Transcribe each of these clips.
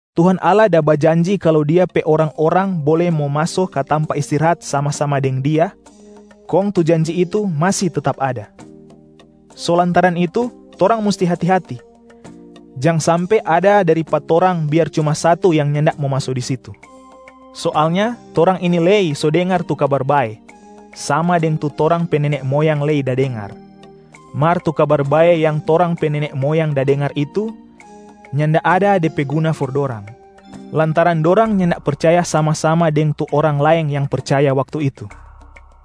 Tuhan Allah da bajanji kalu Dia pe orang-orang bole mo maso ka tampa istirahat sama-sama deng Dia, kong tu janji itu masi tetap ada. So lantaran itu torang musti hati-hati, jang sampe ada dari pa torang biar cuma satu yang nyanda mo maso di situ. Soalnya torang ini lei so dengar tu Kabar Bae sama deng tu torang pe nene moyang lei da dengar. Mar tu Kabar Bae yang torang pe nene moyang da dengar itu nyanda ada de pe guna for dorang, lantaran dorang nyanda percaya sama-sama deng tu orang laeng yang percaya waktu itu.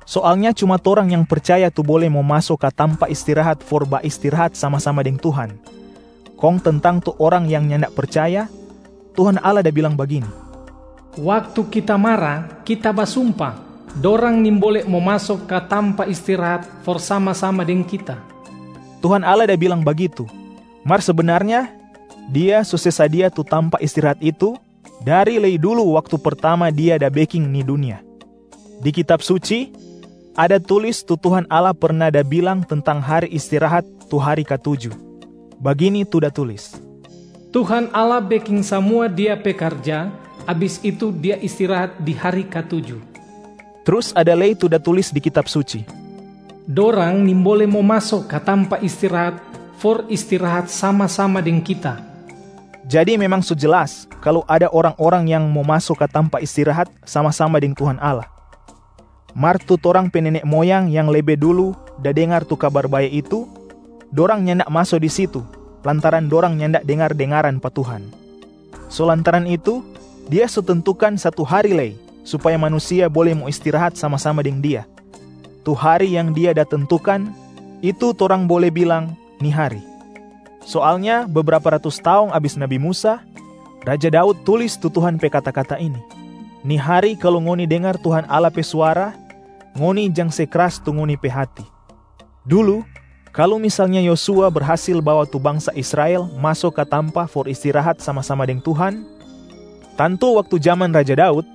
Soalnya cuma torang yang percaya tu bole mo maso ka tampa istirahat for baistirahat sama-sama deng Tuhan, kong tentang tu orang yang nyanda percaya, Tuhan Allah da bilang ini, “Waktu Kita mara, Kita basumpa, ‘Dorang nimbole mo maso ka tampa istirahat for sama-sama deng Kita.’” Tuhan Allah da bilang bagitu, mar sebenarnya Dia so se sadia tu tampa istirahat itu dari lei dulu waktu pertama Dia da beking ni dunia. Di Kitab Suci, ada tulis tu Tuhan Allah perna da bilang tentang hari istirahat tu hari katuju. Bagini tu da tulis, “Tuhan Allah beking samua Dia pe karja, abis itu Dia istirahat di hari katuju.” Trus ada lei tu da tulis di Kitab Suci, “Dorang nimbole mo maso ka tampa istirahat for istirahat sama-sama deng Kita.” Jadi memang so jelas kalu ada orang-orang yang mo maso ka tampa istirahat sama-sama deng Tuhan Allah, mar tu torang pe nene moyang yang lebe dulu da dengar tu Kabar Bae itu, dorang nyanda maso di situ lantaran dorang nyanda dengar-dengaran pa Tuhan. So lantaran itu Dia so tentukan satu hari lei supaya manusia bole mo istirahat sama-sama deng Dia. Tu hari yang Dia da tentukan, itu torang bole bilang “Ni hari”. Soalnya bebrapa ratus taong abis nabi Musa, raja Daud tulis tu Tuhan pe kata-kata ini, “Ni hari, kalu ngoni dengar Tuhan Allah pe suara, ngoni jang se kras tu ngoni pe hati.” Dulu, kalu misalnya Yosua berhasil bawa tu bangsa Israel maso ka tampa for istirahat sama-sama deng Tuhan, tantu waktu jaman Raja Daud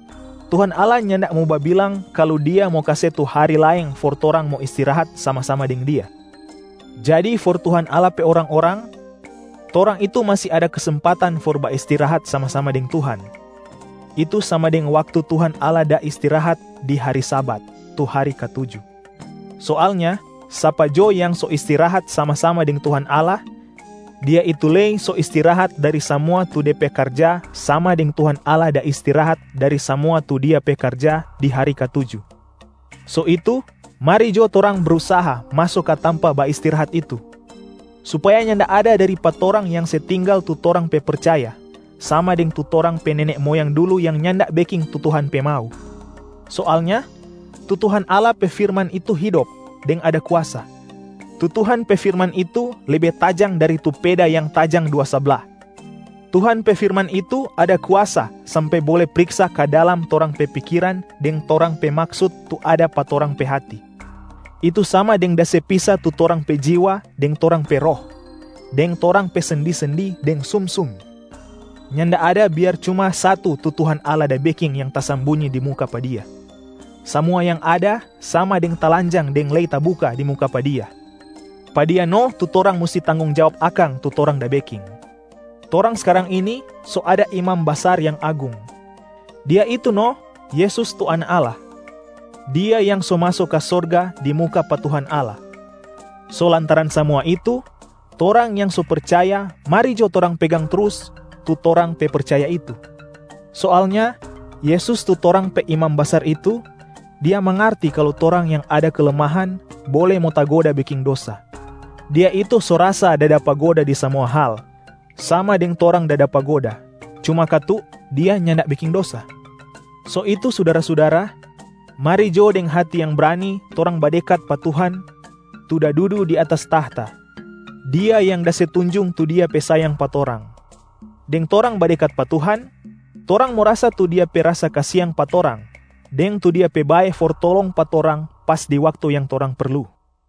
Tuhan Allah nyanda mo babilang kalu Dia mo kase tu hari laeng for torang mo istirahat sama-sama deng Dia. Jadi for Tuhan Allah pe orang-orang, torang itu masi ada kesempatan for baistirahat sama-sama deng Tuhan, itu sama deng waktu Tuhan Allah da istirahat di hari Sabat, tu hari katuju. Soalnya sapa jo yang so istirahat sama-sama deng Tuhan Allah, dia itu lei so istirahat dari samua tu de pe karja sama deng Tuhan Allah da istirahat dari samua tu Dia pe karja di hari katuju. So itu mari jo torang brusaha maso ka tampa baistirahat itu, supaya nyanda ada dari pa torang yang se tinggal tu torang pe percaya, sama deng tu torang pe nene moyang dulu yang nyanda beking tu Tuhan pe mau. Soalnya tu Tuhan Allah pe firman itu hidop deng ada kuasa. Tu Tuhan pe firman itu lebe tajang dari tu peda yang tajang dua sabla. Tuhan pe firman itu ada kuasa sampe bole priksa ka dalam torang pe pikiran deng torang pe maksut tu ada pa torang pe hati, itu sama deng da se pisa tu torang pe jiwa deng torang pe roh, deng torang pe sendi-sendi deng sumsum. Nyanda ada biar cuma satu tu Tuhan Allah da beking yang tasambunyi di muka pa Dia. Samua yang ada, sama deng talanjang deng lei tabuka di muka pa Dia. Pa Dia no tu torang musti tanggong jawab akang tu torang da beking. Torang skarang ini so ada Imam Basar yang Agung. Dia itu no Yesus tu Anak Allah. Dia yang so maso ka sorga di muka pa Tuhan Allah. So lantaran samua itu, torang yang so percaya, mari jo torang pegang trus tu torang pe percaya itu. Soalnya Yesus tu torang pe Imam Basar itu, Dia mangarti kalu torang yang ada kelemahan bole mo tagoda beking dosa. Dia itu so rasa da dapa goda di samua hal, sama deng torang da dapa goda, cuma katu Dia nyanda beking dosa. So itu sudara-sudara, mari jo deng hati yang brani torang badekat pa Tuhan tu da dudu di atas tahta, Dia yang da se tunjung tu Dia pe sayang pa torang. Deng torang badekat pa Tuhan, torang mo rasa tu Dia pe rasa kasiang pa torang deng tu Dia pe bae for tolong pa torang pas di waktu yang torang perlu.